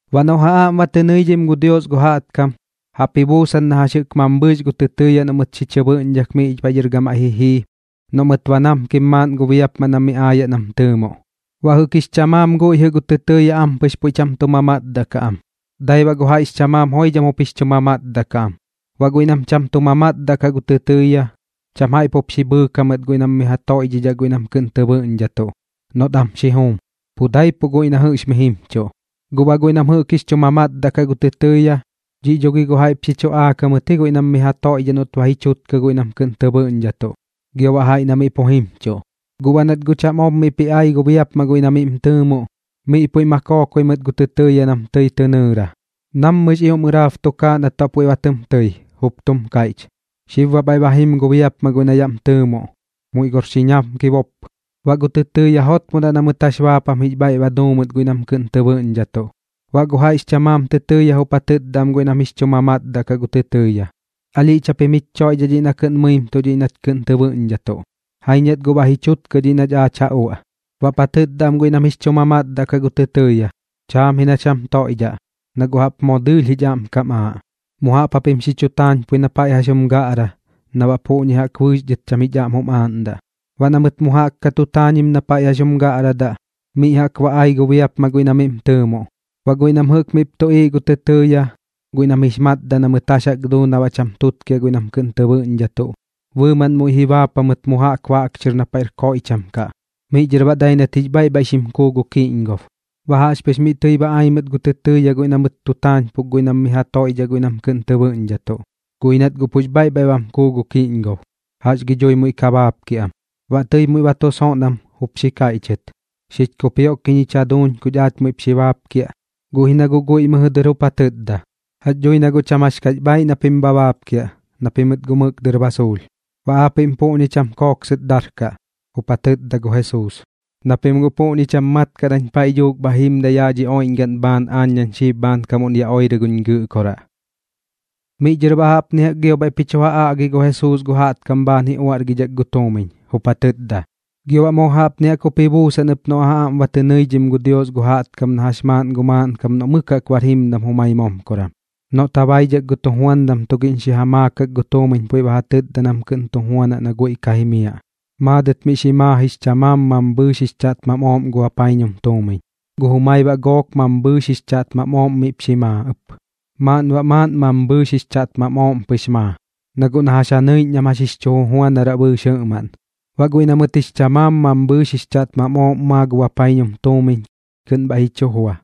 ’Baꞌ noꞌ ja aꞌm ba tɨ nɨidhim gu Dios gu jaꞌtkam, jaꞌp ji buusan na jax jɨꞌk mambhɨɨx gu tɨtɨɨya noꞌ mɨt xi chɨ bɨꞌñdhak miꞌ paiꞌ dhɨr gamaiꞌ ji jii, noꞌ mɨt ba namkim maaꞌn gu biapmaꞌ na miꞌ aayaꞌ na miꞌm tɨɨmoꞌ. Baꞌ jaiꞌ jɨꞌk jix chamaam guiꞌ jɨꞌ gu tɨtɨɨya ampɨx puiꞌ cham tu mamatdaꞌ kaꞌ am, dai baꞌ gu jaiꞌx chamaam joidham jup jix chu mamatdaꞌ kaꞌ am. Baꞌ guiꞌ nam cham tu mamatdaꞌ kaꞌ gu tɨtɨɨya, cham jaiꞌ pup xi bhɨɨk jamɨt guiꞌ nam mi ja toiꞌdhaꞌ guiꞌ nam kɨꞌn tɨ bɨꞌñdhatuꞌ noꞌt am xi juum, pu daipuꞌ guiꞌ na jɨꞌx mi jimchuꞌ. Guꞌ baꞌ guiꞌ nam jɨꞌk jix chu mamatdaꞌ kaꞌ gu tɨtɨɨya, dhiꞌ dho gi guꞌ jaiꞌp xi chuꞌaak jamɨt ji guiꞌ nam mi ja toiꞌdhaꞌ noꞌt ba ji chutkɨ guiꞌ nam kɨꞌn tɨ bɨꞌñdhatuꞌ, gio baꞌ jaiꞌ na miꞌ pu jimchuꞌ. Guꞌ baꞌ nat guꞌ cham ob miꞌp ji ai gu biapmaꞌ guiꞌ na miꞌm tɨɨmoꞌ, miꞌ puiꞌ ma kookoi mɨt gu tɨtɨɨya nam tɨi tɨ nɨɨra. Nammɨx ioꞌm ɨraab tukaaꞌ nat baꞌ puiꞌ ba tɨm tɨi, jup tum kaiꞌch: “Xib baꞌ bhaiꞌ ba jim gu biapmaꞌ guiꞌ na yaꞌm tɨɨmoꞌ. Muiꞌ gor xi ñamkibop.” Baꞌ gu tɨtɨɨya jotmodaꞌ na mɨt jax baapam jix bhaiꞌ ba ja duu mɨt guiꞌ nam kɨꞌn tɨ bɨꞌñdhatuꞌ. Baꞌ gu jaiꞌx chamaam tɨtɨɨya jup ja tɨtda am guiꞌ nam jix chu mamatdaꞌ kaꞌ gu tɨtɨɨya: “Alhiꞌch japim jich choiꞌdhaꞌ dhiꞌ na kɨꞌn mɨmɨimtuꞌ dhiꞌ nach kɨꞌn tɨ bɨꞌñdhatuꞌ. Jaiñ nat guꞌ ba ji chutkɨ dhiꞌ nach aach ja uaꞌ.” Baꞌp ja tɨtda am guiꞌ nam jix chu mamatdaꞌ kaꞌ gu tɨtɨɨya: “Chaam ji nach jam toiꞌdhaꞌ, na guꞌ jaꞌp moo dɨɨlh jich aꞌm kam aaꞌ. Mu jaꞌp japim xi chu taañpui na paiꞌ jax jum gaꞌra na baꞌ puꞌñi jaꞌk bɨɨx dhɨt cham jich aꞌm jum aaꞌndaꞌ.” Baꞌ na mɨt mu jaꞌk ka tu taañim na paiꞌ jax jum gaꞌradaꞌ, miꞌ jaꞌk ba ai gu biapmaꞌ guiꞌ na miꞌm tɨɨmoꞌ. Baꞌ guiꞌ nam jɨꞌk miꞌp tuꞌiiꞌ gu tɨtɨɨya, guiꞌ nam jix matdaꞌ na mɨt jax jaꞌk duu na baꞌ cham tutkiaꞌ guiꞌ nam kɨꞌn tɨ bɨꞌñdhatuꞌ, bɨɨmaꞌn muiꞌ ji baap jamɨt mu jaꞌk baꞌk chɨr miꞌ na paiꞌr koiꞌcham kaꞌ. Miꞌ dhɨr baꞌ dai nat jix bhaiꞌ bhaiꞌ xim kuu gu kiꞌñgob. Baꞌ jaꞌxpɨx miꞌ tɨi ba ai mɨt gu tɨtɨɨya guiꞌ na mɨt tu taañpuk guiꞌ nam mi ja toiꞌdhaꞌ guiꞌ nam kɨꞌn tɨ bɨꞌñdhatuꞌ, guꞌ ji nat guꞌ pux bhaiꞌ bhaiꞌ bam kuu gu kiꞌñgob. ¿Jax gi dhui muiꞌ ka baapkiaꞌ am? Baꞌ tɨi muiꞌ ba tu soon am jup xi kaiꞌchɨt: “¡Xich kupioꞌkiꞌñ jich jaduuñ kuch aach muiꞌp xi baapkiaꞌ!” Guꞌ ji na guꞌ guiꞌ mɨjɨ dɨr jup ja tɨtda: “Jax dhui na guꞌ cham jax kax bhaaiꞌ na pim bha baapkiaꞌ, na pimɨt guꞌ mɨk dɨr ba suulh.” ’Baꞌ aapiꞌm puꞌñi cham kooksɨt darkaꞌ ―jup ja tɨtda gu Jesuus―, na pim guꞌ puꞌñi cham mat kaꞌ nañ paiꞌ dhuuk bha jimdaꞌ yaꞌ dhi oiꞌñgaꞌn bhaan aañ nañ xib bhaankam yaꞌ oirɨ guñ Gɨꞌkoraꞌ. Miꞌ dhɨr baꞌ jaꞌpni jaꞌk gio bhaiꞌp ji chu ja aꞌgi gu Jesuus gu jaꞌtkam bhaan ji uaꞌrgidhak gu tuumiñ, jup ja tɨtda: ―Gio baꞌ moo jaꞌpni jaꞌk jup ji buusan ɨp noꞌ ja aꞌm tɨ nɨidhim gu Dios gu jaꞌtkam na jax maaꞌn gu maaꞌnkam noꞌ mɨk jaꞌk bar jimdam jumai momkoran, noꞌt ja baidhak gu tujuandam tugiꞌñ xi ja maakak gu tuumiñ puiꞌ ba ja tɨtda nam kɨꞌn tu juanaꞌ na guiꞌ ka jimiaꞌ. ’Maadɨt miꞌ xi maa jix chamaam mambhɨɨx jix chaꞌtmam ooꞌm gu bapaiñum tuumiñ, gu jumai baꞌ gook mambhɨɨx jix chaꞌtmam ooꞌm miꞌp xi maa ɨp, maaꞌn baꞌ maaꞌn mambhɨɨx jix chaꞌtmam ooꞌm pɨx maa, na guꞌ na jax ja nɨiꞌñ nam jax jix chu jujuanaraꞌ bɨɨx jɨꞌmaꞌn. Baꞌ guiꞌ na mɨt jix chamaam mambhɨɨx jix chaꞌtmam ooꞌm maa gu bapaiñum tuumiñ kɨꞌn bhaiꞌ ji chu jua,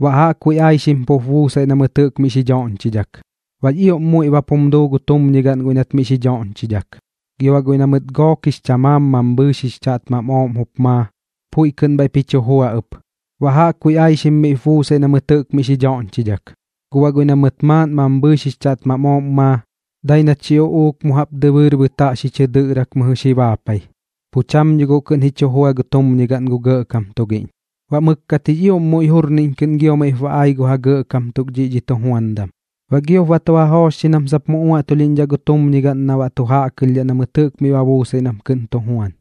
baꞌ jaꞌkbuiꞌ aixim miꞌ pu buusaiꞌ na mɨt jɨꞌk miꞌ xi dhoꞌñchidhak, baꞌx ioꞌm muiꞌ bap jum duu gu tumñigaꞌn guiꞌ nat miꞌ doꞌñchidhak. Gio baꞌ guiꞌ na mɨt gook jix chamaam mambhɨɨx jix chaꞌtmam ooꞌm jup maa, puiꞌ kɨꞌn bhaiꞌp ji chu jua ɨp, baꞌ jaꞌkbuiꞌ aixkam miꞌp buusaiꞌ na mɨt jɨꞌk miꞌ xi dhoꞌñchidhak. Guꞌ baꞌ guiꞌ na mɨt maaꞌn mambhɨɨx jix chaꞌtmam ooꞌm maa, dai nat xi uꞌuuk mu jaꞌp dɨbɨɨr bɨtaꞌ xi chɨ dɨꞌrak mɨjɨ xi baapai, pu cham dho guꞌ kɨꞌn ji chu jua gu tumñigaꞌn gu gɇꞌkam tugiꞌñ. ’Baꞌ mɨkkat jix ioꞌm muiꞌ jurniꞌñ kɨꞌn gio miꞌp ba ai gu ja gɇꞌkam tuk dhiꞌ dhi tujuandam, baꞌ giop ba tu ja joochxi nam sap mu uaꞌtulhiꞌñdhaꞌ gu tumñigaꞌn na baꞌ tu jaꞌkɨlhdhaꞌ na mɨt jɨꞌk miꞌ ba buusaiꞌ nam kɨꞌn tu juan.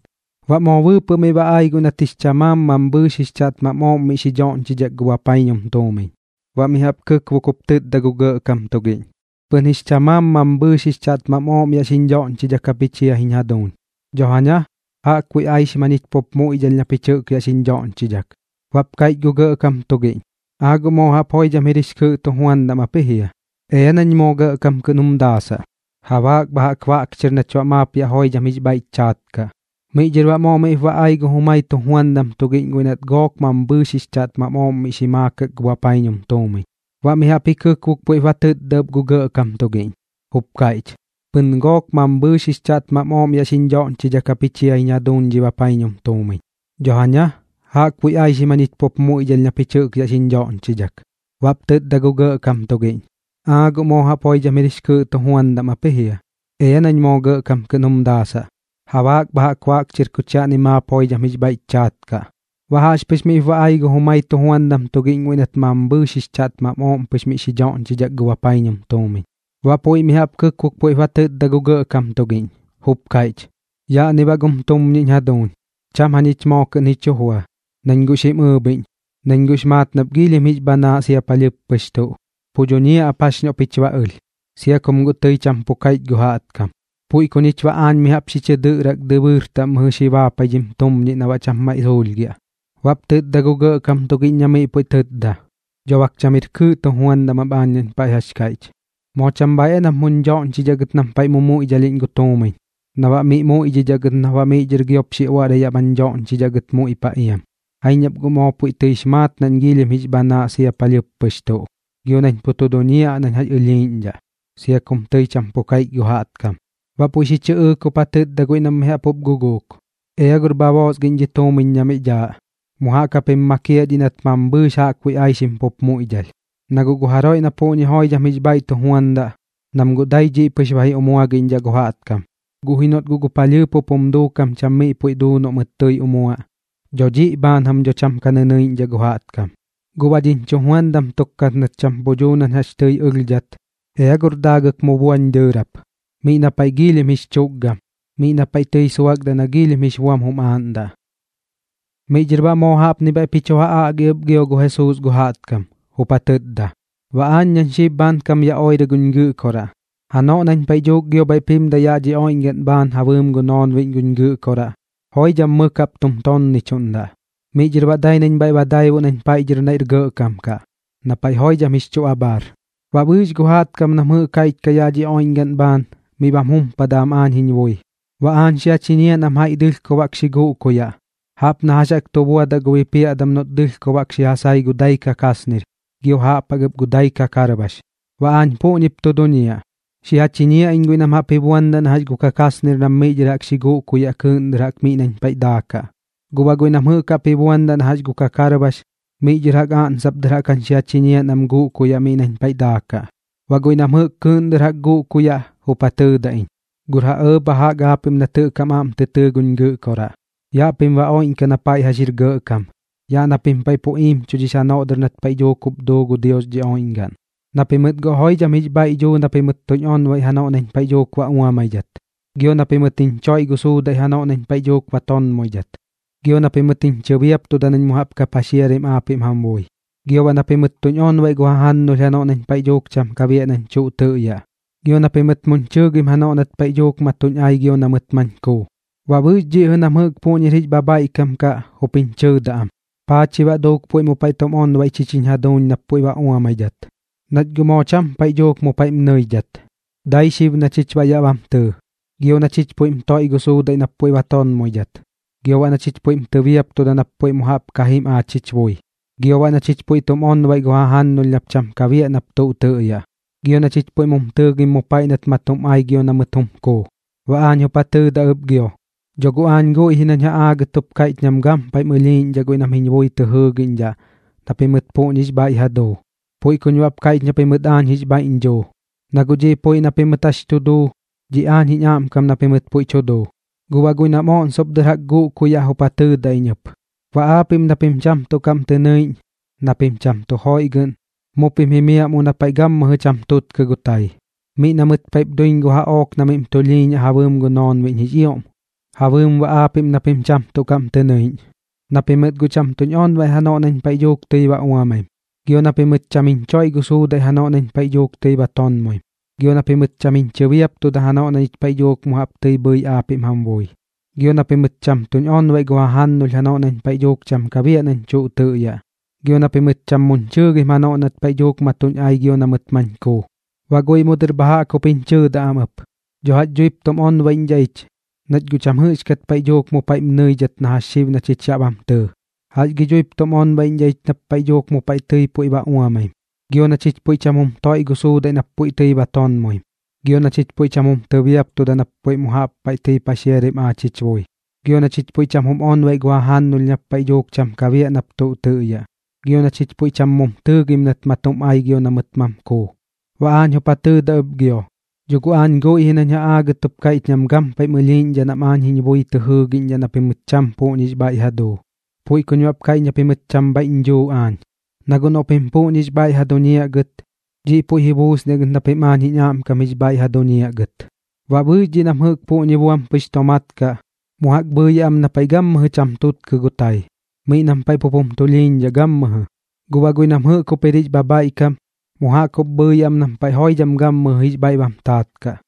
Baꞌ moo bɨɨpɨꞌ miꞌ ba ai guiꞌ nat jix chamaam mambhɨɨx jix chaꞌtmam ooꞌm miꞌ xi dhoꞌñchidhak gu bapaiñum tuumiñ, baꞌ mi jaꞌp ji kɨkbok jup tɨtda gu gɇꞌkam tugiꞌñ: “Pɨn jix chamaam mambhɨɨx jix chaꞌtmam ooꞌm yaꞌ xiñ dhoꞌñchidhak japich jia jiñ jaduuñ. Dho jaña, jaꞌkbuiꞌ aixim jañich pup muiꞌdhalh na pich jɨꞌk yaꞌ xiñ dhoꞌñchidhak.” Baꞌp kaiꞌch gu gɇꞌkam tugiꞌñ: “¡Aa guꞌ moo jaꞌp joidham jir jix kɨɨꞌ tujuandam ap ji jia! Ea nañ moo gɇꞌkam kɨꞌn jum daasaꞌ. Jabaak bha jaꞌk baꞌk chɨr nach baꞌ maap yaꞌ joidham jix bhaiꞌch chaat kaꞌ.” Miꞌ dhɨr baꞌ moo miꞌp ba ai gu jumai tujuandam tugiꞌñ guiꞌ nat gook mambhɨɨx jix chaꞌtmam ooꞌm miꞌ xi maakak gu bapaiñum tuumiñ, baꞌ mi jaꞌp ji kɨkbok puiꞌp ba tɨtda ɨp gu gɇꞌkam tugiꞌñ, jup kaiꞌch: “Pɨn gook mambhɨɨx jix chaꞌtmam ooꞌm yaꞌ xiñ dhoꞌñchidhak japich jia jiñ jaduuñ dhi bapaiñum tuumiñ. Dho jaña, jaꞌkbuiꞌ aixim jañich pup muiꞌdhalh na pich jɨꞌk ya xiñ dhoꞌñchidhak.” Baꞌp tɨtda gu gɇꞌkam tugiꞌñ: “¡Aa guꞌ moo jaꞌp joidham jir jix kɨɨꞌ tujuandam ap ji jia! Ea nañ moo gɇꞌkam kɨꞌn jum daasaꞌ. Jabaak bha jaꞌk baꞌk chɨr kuch yaꞌni maap joidham jix bhaiꞌch chaat kaꞌ.” Baꞌ jaꞌxpɨx miꞌp ba ai gu jumai tujuandam tugiꞌñ guiꞌ nat mambhɨɨx jix chaꞌtmam ooꞌm pɨx miꞌ xi dhoꞌñchidhak gu bapaiñum tuumiñ, baꞌ puiꞌ mi jaꞌp ji kɨkbok puiꞌp ba tɨtda gu gɇꞌkam tugiꞌñ, jup kaiꞌch: “Yaꞌni baꞌ gum tumñiꞌ jiñ jaduuñ. Cham jañich moo kɨꞌn ji chu jua, nañ guꞌ xim ɨɨbhiꞌñ, nañ guꞌx maat nap giilhim jix bhanaaꞌ sia palhɨɨp pɨx tuꞌ, pu duñiaꞌ ap jax noꞌ pich ba ɨlh, sia kum guꞌ tɨi cham pu kaiꞌch gu jaꞌtkam. Puiꞌ ku ñich baꞌ aañ mi jaꞌp xi chɨ dɨꞌrak dɨbɨɨr taꞌm mɨjɨ xi baapai dhim tumñiꞌ na baꞌ cham maiꞌ suulhgiaꞌ.” Baꞌp tɨtda gu gɇꞌkam tugiꞌñ na miꞌ puiꞌ tɨtda: “Dho bak cham jir kɨɨꞌ tujuandam ap aañ nañ paiꞌ jax kaiꞌch. ¿Moo cham bhaiꞌ aa nap muñ dhoꞌñchidhaꞌ gɨt nam paiꞌ mumuiꞌdhalhiꞌñ gu tuumiñ, na baꞌ miꞌ muiꞌdhidhaꞌ gɨt nap baꞌ miꞌ dhɨr giop xi uaꞌrai yaꞌ bañ doꞌñxidhaꞌ gɨt muiꞌ paꞌ iam? Jaiñ nap guꞌ moo puiꞌ tɨix maat nañ puiꞌ giilhim jix bhanaaꞌ sia palhɨɨp pɨx tuꞌ, gio nañ pu tu duñiaꞌ nañ jax ɨlhiiꞌñdhaꞌ, sia kum tɨi cham pu kaiꞌch gu jaꞌtkam.” Baꞌ puiꞌ xi chɨꞌɨɨk jup ja tɨtda guiꞌ nam mi jaꞌp jup guguuk: “Ea gor bha boosgiꞌñ dhi tuumiñ na miꞌ dhaaꞌ, mu jaꞌk japim makiaꞌ dhiꞌ nat mambhɨɨx jaꞌkbuiꞌ aixkam pup muiꞌdhalh. Na guꞌ gu jaroiꞌ na puꞌñi joidham jix bhaiꞌ tu juandaꞌ, nam guꞌ dai dhiꞌ pɨx ba ji umuagiꞌñdhaꞌ gu jaꞌtkam. Guꞌ ji noꞌt guꞌ gu palhɨɨp jup jum duukam cham miꞌ puiꞌ duu noꞌt mɨt tɨi umuaꞌ, dho dhiꞌ bhaan jam dho cham ka nɨnɨiꞌñdhaꞌ gu jaꞌtkam. Guꞌ baꞌ dhiñ chujuandam tuk nat cham pu dhuu nañ jax tɨi ɨlhdhat, ea gor daagɨk mu buañ dɨɨrap miꞌ na paiꞌ giilhim jix chukgam, miꞌ na paiꞌ tɨi suakdaꞌ na giilhim jix buam jum aaꞌndaꞌ.” Miꞌ dhɨr baꞌ moo jaꞌpni bhaiꞌp ji chu ja aꞌgi ɨp gio gu Jesuus gu jaꞌtkam, jup ja tɨtda: ―Baꞌ aañ nañ xib bhaankam yaꞌ oirɨ guñ Gɨꞌkoraꞌ, janoꞌ nañ paiꞌ dhuuk gio bhaiꞌp jimdaꞌ yaꞌ dhi oiꞌñgaꞌn bhaan ja bɨɨm gu noonbiꞌñ guñ Gɨꞌkoraꞌ, joidham mɨk jaꞌp tum tonnichuꞌndaꞌ. Miꞌ dhɨr baꞌ dai nañ bhaiꞌ ba daibuꞌ bhaiꞌ nañ paiꞌ dhɨr naiꞌr gɇꞌkam kaꞌ, na paiꞌ joidham jix chu abhaar. Baꞌ bɨɨx gu jaꞌtkam nam jɨꞌk jix jaiꞌch kaꞌ yaꞌ dhi oiꞌñgaꞌn bhaan miꞌ bam jumpadaꞌ am aañ jiñ bui, baꞌ aañ xi ja chiñiaꞌ nam jaiꞌ dɨlhkob jaꞌk xi guꞌkuyaꞌ, jaꞌp na jax jaꞌk tu buadaꞌ gu bipiaꞌdam noꞌt dɨlhkob jaꞌk xi ja sai gu dai kakasnir gio jaꞌp jaꞌk ɨp gu dai kakarbax. Baꞌ aañ puꞌñip tu duñiaꞌ, xi ja chiñiaꞌ iñ guiꞌ nam jaꞌp ji buandaꞌ na jax gu kakasnir nam miꞌ dhɨr jaꞌk xi guꞌkuyaꞌ kɨɨꞌn dɨr jaꞌk miꞌ nañ paiꞌ daakaꞌ, guꞌ baꞌ guiꞌ nam jɨꞌk jaꞌp jup ji buandaꞌ na jax gu kakarbax, miꞌ dhɨr jaꞌk oꞌnsop dɨr jaꞌk jañ jup xi ja chiñiaꞌ nam guꞌkuyaꞌ miꞌ nañ paiꞌ daakaꞌ. Baꞌ guiꞌ nam jɨꞌk kɨɨꞌn dɨr jaꞌk guꞌkuyaꞌ jup ja tɨɨdaꞌ iñ: “Gor ja ɇɇ bha jaꞌk aapiꞌm nat jɨꞌk jam aꞌm tɨ tɨɨ guñ Gɨꞌkoraꞌ. Yaꞌ pim baꞌ oiꞌñkaꞌ na paiꞌ jax jir gɇꞌkam, yaꞌ na pim paiꞌ pu iimchudhix janoꞌ dɨr nat paiꞌ dhuuk jup duu gu Dios dhi oiꞌñgaꞌn. Na pimɨt guꞌ joidham jix bhaiꞌ dhuu na pimɨt tuñ onbaiꞌ janoꞌ nañ paiꞌ dhuuk ba uamaidhat, gio na pimɨt jiñ choiꞌ gu suudaiꞌ janoꞌ nañ paiꞌ dhuuk ba tonmoidhat, gio na pimɨt jiñ chɨbiaptuda nañ mu jaꞌp ka paxiaraim aapiꞌm jam bui, gio baꞌ na pimɨt tuñ onbaiꞌ gu jajannulh janoꞌ nañ paiꞌ dhuuk cham ka biaꞌ nañ tuꞌ tɨꞌyaꞌ, gio na pimɨt muñ chɨɨgim janoꞌ nat paiꞌ dhuuk ma tuñ ai gio na mɨt mañ kuu.” Baꞌ bɨɨx dhiꞌ jɨꞌ nam jɨꞌk puꞌñir jix bhabhaiꞌkam kaꞌ jup jiñ chɨɨdaꞌ am: “¿Paa chi baꞌ duuk puiꞌ mu paiꞌ tum onbaiꞌ chich jich jaduuñ nap puiꞌ ba uamaidhat, nach guꞌ moo cham paiꞌ dhuuk mu paiꞌm nɨidhat, dai xib na chich baꞌ yaꞌ bam tɨɨ, gio na chich puiꞌm toiꞌ gu suudaiꞌ nap puiꞌ ba tonmoidhat, gio baꞌ na chich puiꞌm tɨbiaptuda nap puiꞌ mu jaꞌp ka jim aach jich bui, gio baꞌ na chich puiꞌ tum onbaiꞌ gu jajannulh nap cham ka biaꞌ kat nap tuꞌ tɨꞌyaꞌ, gio na chich puiꞌ mum tɨɨgim mu paiꞌ nat ma tum ai gio na mɨt jum kuu?” Baꞌ aañ jup ja tɨɨdaꞌ ɨp gio: “Dho guꞌ aañ guiꞌ ji nañ ja aagɨt jup kaiꞌch nam gampaiꞌm ɨlhiiꞌñdhaꞌ guiꞌ nam jiñ bui tɨ jɨɨgiꞌñdhaꞌ na pimɨt puꞌñix bhaiꞌ ja duu, puiꞌ kuñ baꞌp kaiꞌch na pimɨt aañ jix bhaiꞌñ dhuu. Na guꞌ dhiꞌ puiꞌ na pimɨt jax tu duu, dhiꞌ aañ jiñ aꞌmkam na pimɨt puiꞌ tu duu.” ’Guꞌ baꞌ guiꞌ nam oꞌnsop dɨr jaꞌk jup guꞌkuyaꞌ jup ja tɨɨdaꞌ iñ ɨp: “Baꞌ aapiꞌm na pim cham tuꞌ kaꞌm tɨ nɨiꞌñ, na pim cham tu joiꞌgɨꞌn, mu pim jimiaꞌ mu na paiꞌ gammɨjɨ cham tutkɨ gu tai, miꞌ na mɨt paiꞌp duiñ gu jaꞌook na baꞌ miꞌm tulhiiñaꞌ ja bɨɨm gu noonbiꞌñ jix ioꞌm, ja bɨɨm baꞌ aapiꞌm na pim cham tuꞌ kaꞌm tɨ nɨiꞌñ. Na pimɨt guꞌ cham tuñ onbaiꞌ janoꞌ nañ paiꞌ dhuuk tɨi ba uamaim, gio na pimɨt cham jiñ choiꞌ gu suudaiꞌ janoꞌ nañ paiꞌ dhuuk tɨi ba tonmoim, gio na pimɨt cham jiñ chɨbiaptuda janoꞌ na ñich paiꞌ dhuuk mu jaꞌp tɨi bhɨi aapiꞌm jam bui, gio na pimɨt cham tuñ onbaiꞌ gu jajannulh janoꞌ nañ paiꞌ dhuuk cham ka biaꞌ nañ tuꞌ tɨꞌyaꞌ, gio na pimɨt cham muñ chɨɨgim janoꞌ nat paiꞌ dhuuk ma tuñ ai gio na mɨt mañ kuu.” Baꞌ guiꞌ mu dɨr bha jaꞌk jup jiñ chɨɨdaꞌ am ɨp: “Dho jax dhuip tum onbaiꞌñdhaꞌ ich, nach guꞌ cham jɨꞌxkat paiꞌ dhuuk mu paiꞌm nɨidhat na jax xib na chich yaꞌ bam tɨɨ. ¿Jax gi dhuip tum onbaiꞌñdhaꞌ ich paiꞌ nap duuk mu paiꞌ tɨi puiꞌ ba uamaim, gio na chich puiꞌ cham jum toiꞌ gu suudaiꞌ nap puiꞌ tɨi ba tonmoim, gio na chich puiꞌ cham jum tɨbiaptuda nap puiꞌ mu jaꞌp paiꞌ tɨi paxiaraim aach jich bui, gio na chich puiꞌ cham jum onbaiꞌ gu jajannulh nap puiꞌ cham ka biaꞌ nap tuꞌ tɨꞌyaꞌ, gio na chich puiꞌ cham mum tɨɨgim nat ma tum ai gio na mɨt jum kuu?” Baꞌ aañ jup ja tɨɨdaꞌ ɨp gio: “Dho guꞌ aañ guiꞌ ji nañ ja aagɨt jup kaiꞌch nam gampaiꞌm ɨlhiiꞌñdhaꞌ nam aañ jiñ bui tɨ jɨɨgiꞌñdhaꞌ na pimɨt cham puꞌñix bhaiꞌ ja duu, puiꞌ kuñ baꞌp kaiꞌch na pimɨt cham bhaiꞌñ dhuu aañ. Na guꞌ noꞌ pim puꞌñi jix bhaiꞌ ja duñiaꞌ gɨt, dhiꞌ puiꞌ ji buusniaꞌ gɨt na pim aañ jiñ aꞌmkam jix bhaiꞌ ja duñiaꞌ gɨt.” Baꞌ bɨɨx dhiꞌ nam jɨꞌk puꞌñi buam pɨx tomaat kaꞌ, mu jaꞌk bhɨɨyaꞌ am na paiꞌ gammɨjɨ cham tutkɨ gu tai, miꞌ nam paiꞌ pup jum tulhiiñdhaꞌ gammɨjɨ. Guꞌ baꞌ guiꞌ nam jɨꞌk jup jir jix bhabhaiꞌkam, mu jaꞌk jup bɨɨyaꞌ am nam paiꞌ joidham gammɨjɨ jix bhaiꞌ bam taat kaꞌ.